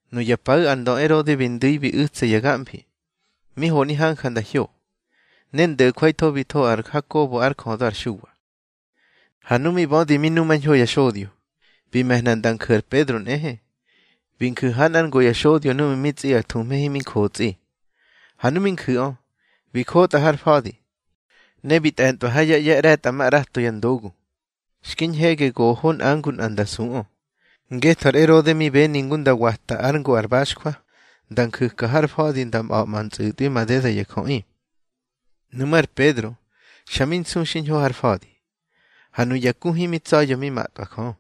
Nuya paꞌu̱ ar ndö Erode bi ndu̱i bi u̱tsa ya gamfi, mi honi hanja nda hyo. Ne ndo̱jwaitho bi tho ar Hakobo ár jödö ar Xuwa. Ha nu mi bödi mi numañho ya xodyo, bi me̱hna nda nju̱ ar Pedro nꞌehe. Bi nju̱ ha nꞌár ngo ya xodyo núꞌmu̱ mi tsꞌi ar thuhme himi jotsꞌi. Ha nu mi nju̱ꞌö, bi jotꞌa har fa̱di. Ne bi tꞌe̱ntꞌwa ha yá ꞌye̱ ꞌre̱tꞌamaꞌrato ya ndogu, xki ñhege goho nꞌa ngu nꞌa nda suꞌö. Ngetho ar Erode mi beni ngu nda wata ár ngo ar baxjwa, nda nju̱ka har fa̱di nda mꞌa̱ꞌma ntsꞌu̱tꞌwi madeda ya jöꞌi. Nuꞌmú̱ ar Pedro, xa mi nsu xiñho har fa̱di. Ha nuya ku himi tsa̱ya̱ mi matꞌwa Jö.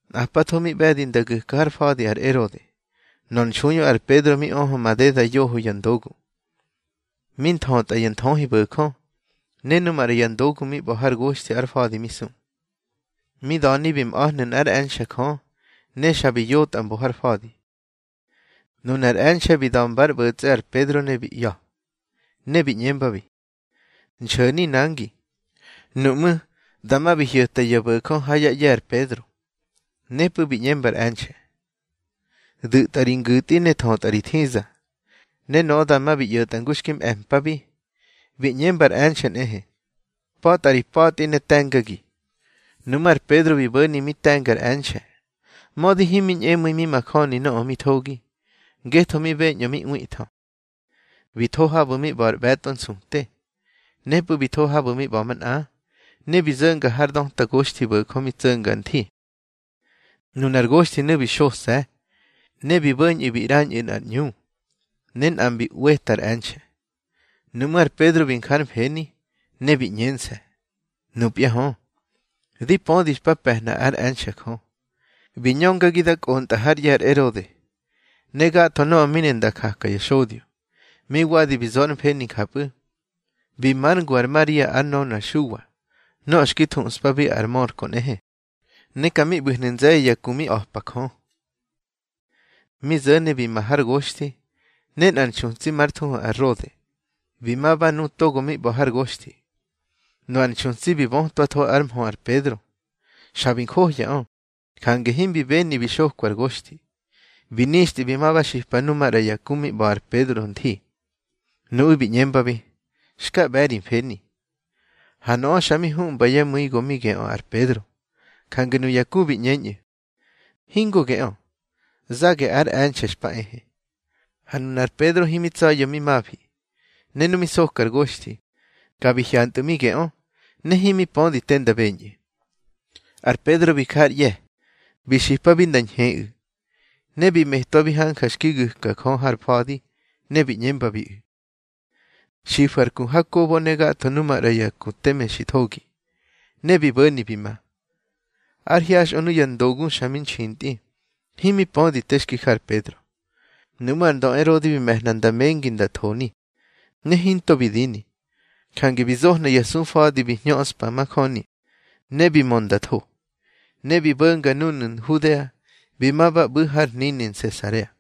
Nꞌapatho mi ꞌbe̱di nda gu̱ka har fa̱di ar Erode, nor nxuiꞌö ar Pedro mi öhö madeda yoho ya ndogu, mi thötꞌa ya nthöhibo̱jö, ne nu maꞌra ya ndogu mi ꞌba̱ hár goxthi ar fa̱di mi su. Mi da̱ni bi mꞌa̱hnu̱ nꞌár e̱nxe̱ Jö, ne xa bi yotꞌa mbo har fa̱di. Nunar e̱nxe̱ bi da̱mbár ꞌbo̱tsꞌe ar Pedro ne bi ꞌya̱, ne bi ꞌñembabi: —Nxo̱ni nangi. Nuꞌmú̱, dama bi hyo̱ta ya bo̱jö ha yá ꞌye̱ ar Pedro. Nepꞌu̱ bi ꞌñemba ar e̱nxe̱: —Du̱tꞌa ri ngu̱tꞌi ne thötꞌa ri thiza. Ne nöꞌö dama bi ꞌyo̱tꞌa ngu xki mꞌe̱pabi. Bi ꞌñemba ar e̱nxe̱ nꞌehe: —Pa̱tꞌa ri pa̱tꞌi, ne te̱ngagi. Nuꞌmú̱ ar Pedro bi bo̱ni mi te̱nga ar e̱nxe̱, mödi himi ñꞌemu̱i mi majöni nöꞌö mi thogi, ngetho mi beñꞌö mi ꞌwiꞌthö. Bi tho habu̱ mi ꞌba̱ ar ꞌbe̱tꞌo nsute. Nepꞌu̱ bi tho habu̱ mi ꞌba̱ manꞌa, ne bi zo̱nga har döta goxthibo̱jö mi tso̱nga nthi. Nunar goxthinu̱ bi xose̱. Ne bi bo̱ñꞌu̱ bi ꞌrañꞌu̱ nꞌar ꞌñu. Ne nꞌa mbi ꞌweta ar e̱nxe̱. Nuꞌmú̱ ar Pedro bi nja ár mfeni, ne bi ꞌñense̱: —Nupya hö, di pödi xpa pe̱hna ár e̱nxe̱ Jö, bi ñöngagi da kꞌontꞌa hár ꞌye̱ ar Erode, ne gatho nöꞌö mi ne nda jaka ya xodyo. Mi wadi bi zo ár mfeni njapꞌu̱, bi már ngu ar Maria ár nönö ar Xuwa, nöꞌö xki thuꞌspabi ar Mörko nꞌehe. Ne ka mi ꞌbu̱hnu̱ nze̱ye̱ ya ku mi a̱pa Jö. Mi zo̱ni bi ma har goxthi, ne nꞌar nxutsi már thuhu ar Rode, bi ma ba nu togo mi ꞌba̱ har goxthi. Nöꞌö ar nxutsi bi bötwatho ár mhö ar Pedro. Xa bi njohyaꞌö, jange himbi beni bi xokwa ar goxthi. Bi nixtꞌi bi ma ba xipa nuꞌu̱ maꞌra ya ku mi ꞌba̱ ar Pedro nthi. Nuꞌu̱ bi ꞌñembabi: —Xka ꞌbe̱ ri mfeni. Ha nöꞌö xa mi huꞌmba yá mu̱i go mi geꞌö ar Pedro. Jange nuya ku bi ꞌñeñꞌu̱: —Hingo geꞌö, zage ár e̱nxe̱ xpa ehe. Ha nunar Pedro himi tsa̱ya̱ mi mafi. Ne nu mi soka ar goxthi, ka bi hyantꞌu̱ mi geꞌö, ne himi pödi te nda beñꞌu̱. Ar Pedro bi ja ár ꞌye̱ bi xipabi nda ñheꞌu̱, ne bi metwabi hanja xki gu̱ka Jö har fa̱di. Ne bi ꞌñembabiꞌu̱: —Xifu̱ ar ku Hakobo ne gatho nu maꞌra ya ku teme xi thogi. Ne bi bo̱ni bi ma. Ár hyaxꞌö nuya ndogu xa mi nxintꞌi, himi pödi te xki ja ar Pedro. Nuꞌmú̱ ar ndö Erode bi me̱hna nda mengi nda thoni, ne hinto bi dini. Jange bi zohna ya sufa̱di bi hñöꞌspa majöni, ne bi mö nda tho. Ne bi bo̱nga núnu̱ Nhudea, bi ma ba ꞌbu̱ har hnini Nsesarea.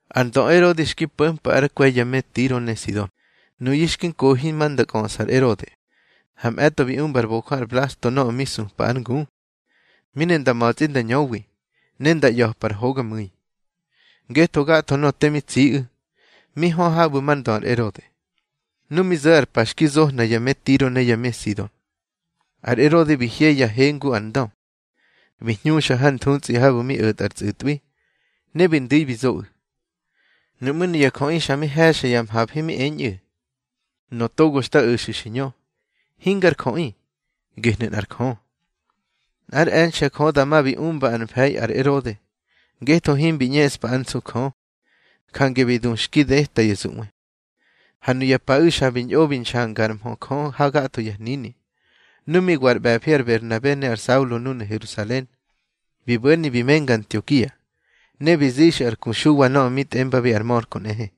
Ar ndö Erode xki po̱mpa ár kwe̱ ya me Tiro ne Sido. Nuyu̱ xki nkohi ma nda kꞌöꞌsa ar Erode. Ha mꞌe̱tꞌo bi umbar bojö ar Blasto nöꞌö mi supa ár ngu, mi ne nda ma̱tsꞌi nda ñöwi, ne nda ꞌya̱par hogamꞌu̱i. Ngetho gatho nöꞌö te mi tsiꞌu̱, mi hö habu̱ mar ndö ar Erode. Nu mi zo̱ ar pa xki zohna ya me Tiro ne ya me Sido, ar Erode bi hye yá he ngu ar ndö, bi hñuxa har nthutsꞌi habu̱ mi o̱tꞌa ar tsꞌu̱tꞌwi, ne bi ndu̱i bi zoꞌu̱. Nuꞌmú̱ nuya jöꞌi xa mi he̱xa ya mhafi mi eñꞌu̱: —Nöꞌö togo xta o̱xu̱ xi ñö, hingar jöꞌi, gehnu̱ nꞌar jö. Nꞌár e̱nxe̱ Jö dama bi umba ar mfe̱i ar Erode, ngetho himbi ꞌñeꞌspa ár nsu Jö. Jange bi du xki deta ya zuꞌwe. Ha nuya paꞌu̱ xa bi ñꞌo bi nxangár mhö Jö hagatho ya hnini. Nu mi wa ar ꞌbe̱fi ar Berhnabe ne ar Saulo núnu̱ Herusalen, bi bo̱ni bi menga Antiokia. Ne bi zixꞌu̱ ar ku Xuwa nöꞌö mi tꞌembabi ar Mörko nꞌehe.